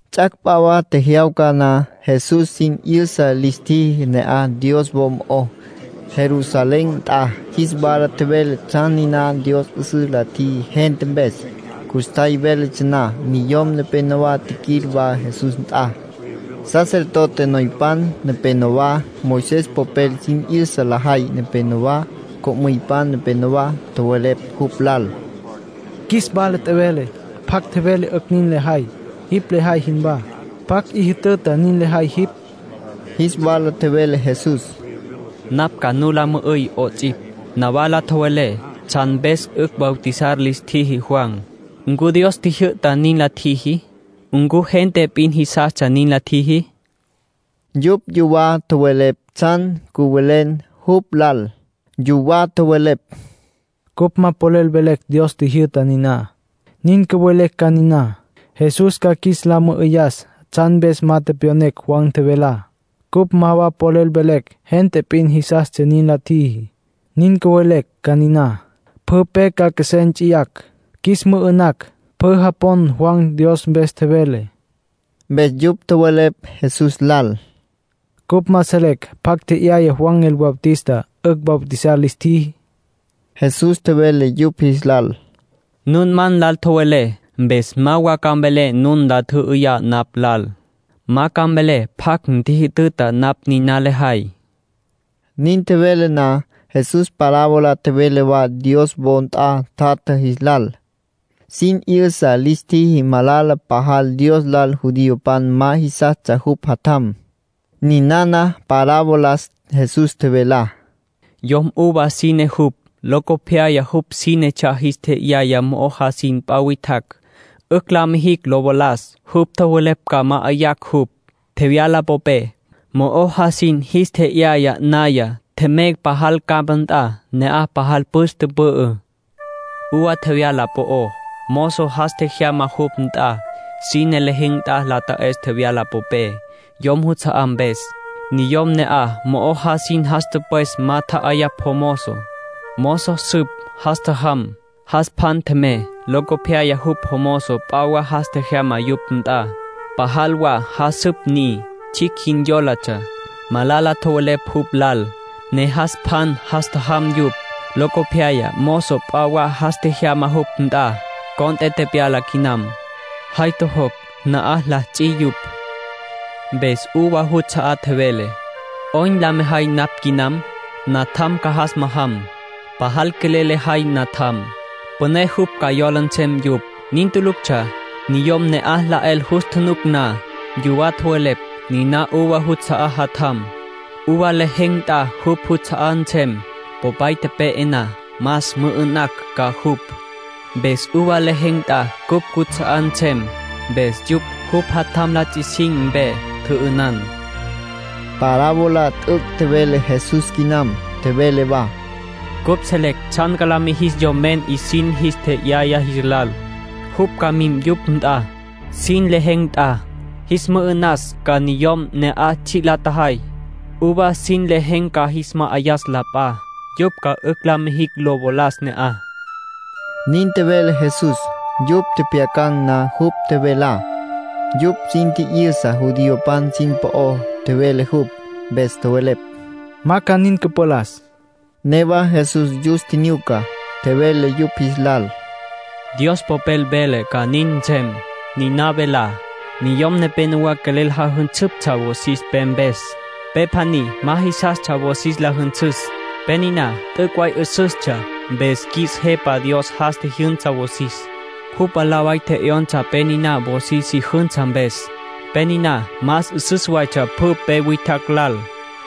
Ts'ac' p'a wa tjejyawca na, Jesús sin 'yüsa lis tjiji ne'aj Dios wo mo'ó, Jerusalén nt'a. Jis wala tjevele tsjan niná Dios 'üsüs la tjiji gente mpes. Custjay véletsja na, niyom nepénowa tjiquil wa Jesús nt'a, sacerdote noypan nepenowá, Moisés popel sin 'yüsa lajay nepenowá, co'müypan nepenowá. Tjowelepj jupj lal: —Qjuis wala tjevele pjacj tjevele 'ücj nin lejay, jipj lejay jinwá. ¿Pjacj 'i jütüta nin lejay jipj? Jis wala tjevele Jesús: —Napj ca nu la mü'üy 'ots'ipj. Nawala tjowelé tsjan mpes 'ücj bautizar lis tjiji Juan. ¿Ncu Dios tjijyü'ta nin la tjiji? ¿Ncu gente p'in jisastsja nin la tjiji? Yupj yuwá tjowelepj tsjan cüwelem jupj lal. Yuwá tjowelepj: “Cupj ma polel velecj Dios tjijyü'ta niná. Nin cüvelecj ca niná, Jesús ca qjuis la mü'üyas tsjan mpes ma tepyonecj Juan tjevelá. Cupj ma wa polel velecj gente p'in jisastsja nin la tjiji. Nin cüvelecj ca niná, pjü pe ca qjuesé nts'iyacj, qjuis mü'ü'nacj. Pjü japon Juan Dios mpes tjevele.” Mpes yupj tjowelepj Jesús lal: —Cupj ma selecj pjacj tje'yaya Juan el Bautista 'ücj bautizar lis tjiji. Jesús tjevele yupj jis lal: —Nun ma nlal tjowelé, mpes ma wa ca mvelé nun nla tjü'üyá napj lal. Ma ca mvelé pjacj ntjijütüta napj niná lejay. Nin tjevele na, Jesús parábola tjevele wa Dios wo nt'a tjatja jis lal. Sin 'yüsa lis tjiji malala pajal Dios lal judiopan ma jisastsja jupj Jatjam. Ninana parabolas Jesús tjevelá: —Yom uva sine jupj. Locopyaya jupj sínetsja jis tje'yaya mo'o jasin p'a witjacj, 'ücj la mijicj lo valas. Yupj tjowelepj ca ma'ayacj jupj, tjevyala popé. Mo'o jasin jis tje'yaya naya, tjemey pajal campa nt'a. Ne'aj pajal püs tüpü'ü. Uva tjevyala po'ó, mozo jas tjejyama yupj nt'a, sine lejen̈ nt'a lo ta'es tjevyala popé, yom juts'a'á mpes. Niyom ne'aj mo'o jasin jas tüpwes ma tja'ayapj jomozo. Mozo süp, jas tjajam. Jas pjan tjemey. Locopyaya jupj mozo p'a wa jas tjejyama yupj nt'a. Pajal wa jasüp ni. Tsjicj jin yólatsja, malala tjowelepj jupj lal, ne jas pjan jas tjajam yupj. Locopyaya mozo p'a wa jas tjejyama yupj nt'a. Cont'e tepyala quinam. Jay tjojocj, na'aj la ts'i yupj. ”Mpes uva juts'a'á tjevele: ‘¿'Oyn la mejay napj quinam? Natjam ca jas majam. Pajal quelel lejay natjam. Püné jupj ca yola nsem yupj.’ Nin tuluctsja. Niyom ne'aj la 'el jus tjunuc na, yuwá tjowelepj: ‘Niná uva juts'a'á jatjam. Uva lejen̈ nt'a jupj juts'a'á nsem, popay tepe'e na. Mas, mü'ü'nacj ca jupj, mpes uva lejen̈ nt'a cupj cuts'a'á nsem.’ Mpes yupj jupj jatjam la ts'i sin mpe, tjü'ünan. —Parábola t'üc' tjevele Jesús quinam. Tjevele wa: —Cupj selecj tsjan ca lis mijis yomen 'isin jis tje'yaya jis lal. Jupj ca mim yupj nt'a, sin lejen̈ nt'a. Jis mü'ü'nas ca niyom ne'aj tsji' la tjajay. Uva sin lejen̈ ca jis ma'ayas la p'a, yupj ca 'ücj la mijicj lo valas ne'aj —nin tjevele Jesús. Yupj tjepjyacan̈ na jupj tjevelá, yupj sin tji'yüsa judiopan sin po'ó tjevele jupj, mpes tjowelepj: —¡Ma ca nin cüpalas! Newa Jesús yus tjinyuca, tjevele yupj jis lal: —Dios Popel vele ca nin nsem. Niná velá: ‘Niyom nepénowa quelel jajünsüptsja wosis pe mpes. Pe pjaní ma jisastsja wosis la jünsüs. Pe niná t'üc' way 'üsüstsja. Mpes qjuis Jepa Dios jas tjijyünsa wosis. Jupj mwalá way tje'yonsa pe niná wosis si jünsa mpes. Pe niná más 'üsüs waytsja pjü pe witjacj lal.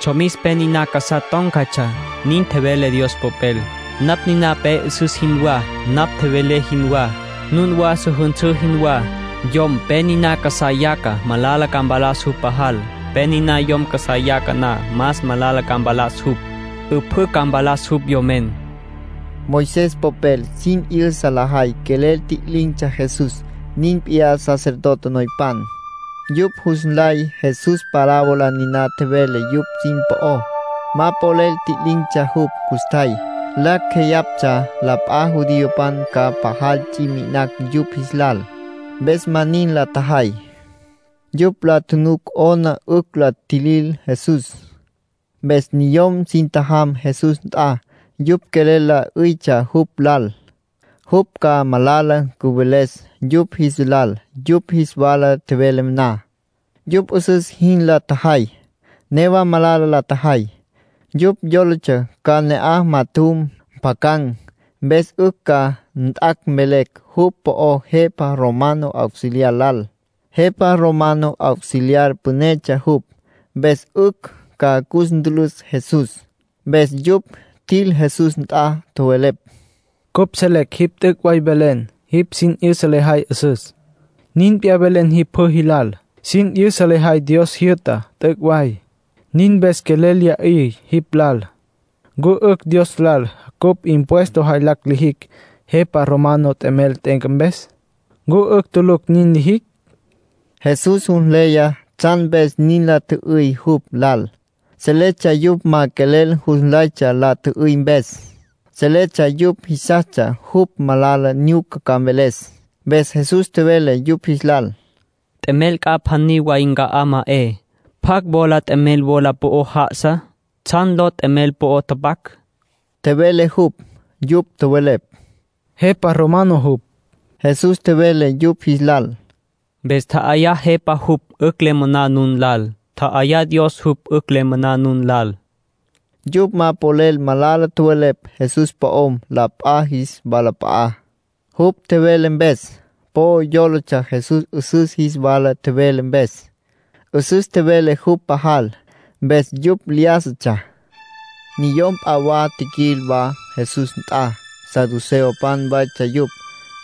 Tsjomis pe niná casá tón̈catsja.’ Nin vele Dios Popel. ”Napj niná pe 'üsüs jinwá, napj tjevelé jinwá. Nun wa su jünsǘ jinwá. Yom pe niná casá yaca, malala ca mpalas jupj pajal. Pe niná yom casá yaca na, más malala ca mpalas jupj. 'Üpjǘ ca mpalas jupj, yomen —tjevele Jesús. Moisés popel sin 'yüsa lajay quelel tji'lin̈tsja Jesús. Nin p'iyá sacerdote noypan. Yupj jus nlay Jesús parábola niná tjevele yupj sin po'ó. Ma polel tji'lin̈tsja jupj custjay. Lacj jeyaptsja la p'a judiopan ca pajal ts'i mi'inacj yupj jis lal, mpes ma nin la tjajay. Yupj la tjunuc 'ona 'ücj la tjilil Jesús. Mpes niyom sin tjajam Jesús nt'a. Yupj quelel la 'üytsja jupj lal, jupj ca malala cüveles yupj jis lal yupj jis wala tjevele na. Yupj 'üsüs jin la tjajay, newa malala la tjajay. Yupj yólatsja ca ne'aj majatjum, mpjacan̈, mpes 'ücj ca jat' mvelecj jupj po'ó jepa romano auxiliar lal. Jepa romano auxiliar pünetsja jupj, mpes 'ücj ca cus ntülüs Jesús. Mpes yupj tjil Jesús nt'a, tjowelepj: —Cupj selecj jipj t'üc' velen. Jipj sin 'yüsa lejay 'üsüs. Nin p'iyá velen jipj pjü jilal. Sin 'yüsa lejay Dios jyü'tá t'üc' way. Nin mpes quelel lya 'yüyacj jipj lal. ¿Ncu 'ücj Dios lal cupj impuesto jaylacj lijicj, jepa romano t'emel t'e'enca mpes? ¿Ncu 'ücj tulucj nin lijicj? Jesús jus nleya tsjan mpes nin la tjü'üy jupj lal. Seletsja yupj ma quelel jus nlaytsja la tjü'üy mpes. Seletsja yupj jisastsja jupj malala nyuca ca mveles. Mpes Jesús tjevele yupj jis lal: —T'emel c'a pjaní way nca'á ma 'e. ¿Pjacj wola t'emel wola po'ó já'asa? ¿Tsjan ló t'emel po'o tapac? —tjevele jupj. Yupj tjowelepj: —Jepa romano jupj. Jesús tjevele yupj jis lal: —Mpes tja'ayá jepá jupj 'ücj le moná nun lal. Tja'ayá Dios jupj 'ücj le moná nun lal —nin tjevele Jesús. Yupj ma polel malala tjowelepj Jesús po'om la p'a jis walap'a'á, jupj tjevele mpes. Po yólatsja Jesús 'üsüs jis wala tjevele mpes. 'Üsüs tjevele jupj pajal, mpes yupj lyájasatsja. Niyom p'a wa tjiquil wa Jesús nt'a. Saduceopan waytsja yupj.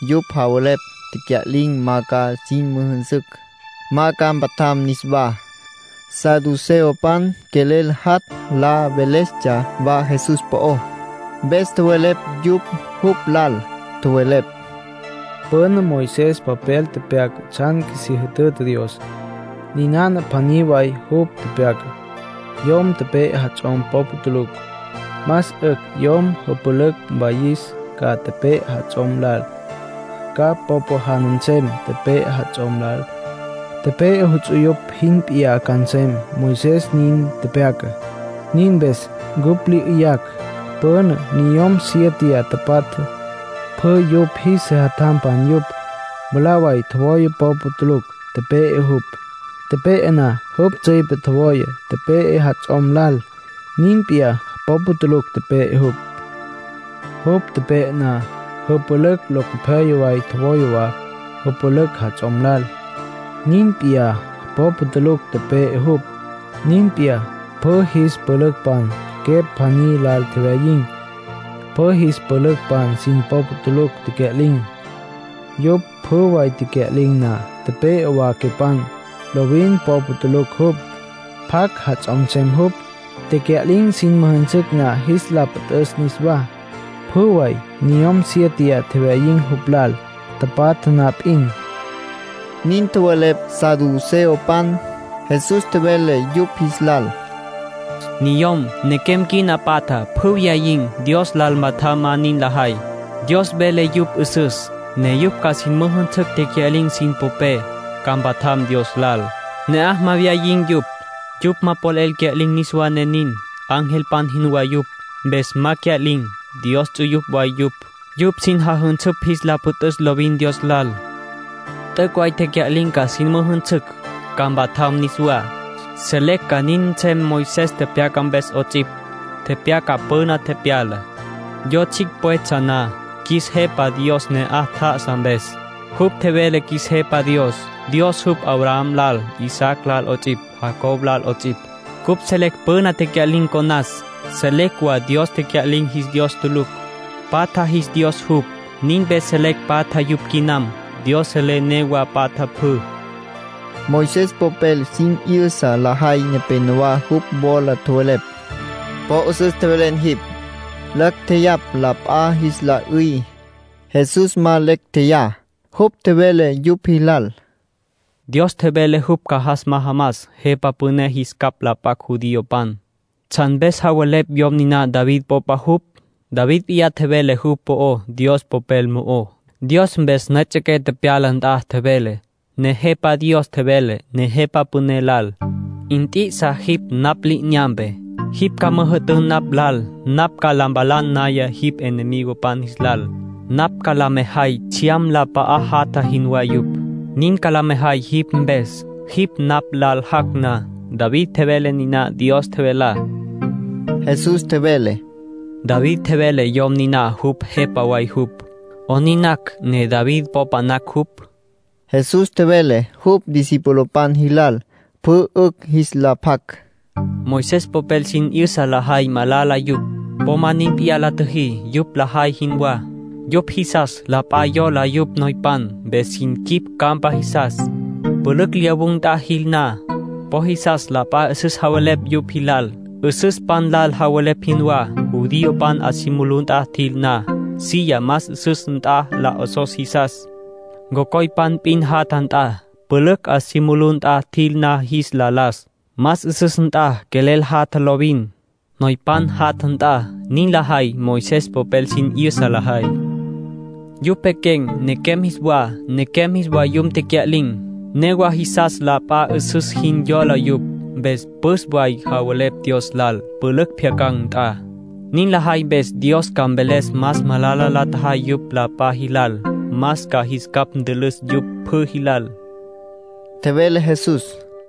Yupj javelepj tecya'lin̈ ma ca sin müjünsücj, ma ca mpatjam niswá. Saduceopan quelel jat' la velestsja wa Jesús po'ó, mpes tjowelepj yupj jupj lal. Tjowelepj: —Püna Moisés popel tepyaca tsjan qjuisí jütüta Dios. Ninana pjaní way jupj tepyacá: yom pe'e jats'om popa tulucj, más 'ücj yom jüpülücj mwayis ca tepe'e jats'om lal. Ca popa jana nsem tepe'e jats'om lal. Tepe'e ts'uyupj jin p'iyá ca nsem. Moisés nin tepyaca. Nin mpes cupj lya 'yüyacj. Püna niyom siéteya tapatja, pjü yupj jis sejatjampan yupj. Mwalá way tjowaya, popa tulucj tepe'e jupj. Tepe'e na, jupj tsüipe tjowaya tepe'e jats'om lal. Nin p'iyá popa tulucj tepe'e jupj. Jupj tepe'e na, jüpülücj locopyaya way tjowaya wa jüpülücj jats'om lal. Nin p'iyá popa tulucj tepe'e jupj. Nin p'iyá pjü jis pülücpan quepj pjaní lal tjewyayin̈. Pjü jis pülücpan sin popa tulucj tecya'lin̈. Yupj pjü way tecya'lin̈ na, tepe'e wa quepan. Lovin popa tulucj jupj. ¿Pjacj jats'om nsem jupj, tecya'lin̈ sin müjünsücj na jis la püt'üs niswá? Pjü way niyom siéteya tjewyayin̈ jupj lal, tapatja na p'in —nin tjowelepj saduceopan. Jesús tjevele yupj jis lal: —Niyom, nequem quina patja pjü wyayin̈. Dios lal patjam ma nin lajay. Dios vele yupj 'üsüs, ne yupj ca sin müjünsücj tecya'lin̈ sin popé, ca mpatjam Dios lal. Ne'aj ma mwayin̈ yupj. Yupj ma polel cya'lin̈ niswá ne nin. Angelpan jinwá yupj, mpes ma cya'lin̈. Dios ts'uyupj way yupj. Yupj sin jajünsüpj jis la püt'üs lovin Dios lal. T'üc' way tecya'lin̈ ca sin müjünsücj, ca mpatjam niswá. Selecj ca nin nsem Moisés tepyaca mpes 'ots'ipj. Tepyaca püna tepyalá, yo tsjicj pwetsja na, qjuis Jepa Dios ne'aj tjá'asa mpes. Jupj tjevele ‘qjuis Jepa Dios Dios jupj Abraham lal, Isaac lal 'ots'ipj, Jacob lal 'ots'ipj’. Cupj selecj püna tecya'lin̈ conas. Selecj wa Dios tecya'lin̈ jis Dios tulucj. Patja jis Dios jupj. Nin mpes selecj patja yupj quinam. Dios selé newa patja pjü —nin tjevele Jesús. Moisés popel sin 'yüsa lajay nepénowa jupj wola tjowelepj: —Po 'üsüs tjevelen jipj. Lacj tjeyapj la p'a jis la 'üy. (Jesús ma lecj tjeyá.) Jupj tjevele yupj jilal: —Dios tjevele jupj ca jas majamas Jepa Püné jis capj la p'acj judiopan. ¿Tsjan mpes javelepj yom niná David popa jupj? David p'iyá tjevele jupj po'ó Dios Popel mo'ó. Dios mpes nüejets'e tepyaca nt'a tjevele: ‘Nejepa Dios tjevele Nejepa Püné lal: “Nt'i'isa jipj napj li'inyampe. Jipj ca müjü'tün napj lal napj ca la mpalan naya jipj enemigopan jis lal. Napj ca la mejay tsjyam la p'a'á jatja jinwá yupj. Nin ca la mejay jipj mpes, jipj napj lal jac' na.” ’ David tjevele niná Dios tjevelá. Jesús tjevele: —David tjevele yom niná jupj Jepa way jupj. ¿'Onin nacj ne David popa nacj jupj? Jesús tjevele jupj discipulopan jilal, pjü 'ücj jis la pjac: —Moisés popel sin 'yüsa lajay malala yupj. Po ma nin p'iyá la tjüjí, yupj lajay jinwá. Yupj jisas la p'a yola yupj noypan, mpes sin quip campa jisas. Pülücj lyawun̈ nt'a jil na, po jisas la p'a 'üsüs javelepj yupj jilal, 'üsüspan lal javelepj jinwá. Judiopan 'a si mulú nt'a jil na, silla más 'üsüs nt'a la 'osos jisas, cocoypan p'in jatja nt'a. Pülücj 'a si mulú nt'a jil na jis la las, más 'üsüs nt'a quelel jatja lovin, noypan jatja nt'a. Nin lajay Moisés popel sin 'yüsa lajay. Yupj pequen̈ nequem jis wa, nequem jis vayum tecya'lin̈. Newa jisas la p'a 'üsüs jin yola yupj, mpes püs way javelepj Dios lal, pülücj pjyacan̈ nt'a. Nin lajay mpes Dios ca mveles más malala la tjajay yupj la p'a jilal. Más ca jis capj ntülüs yupj pjü jilal —tjevele Jesús.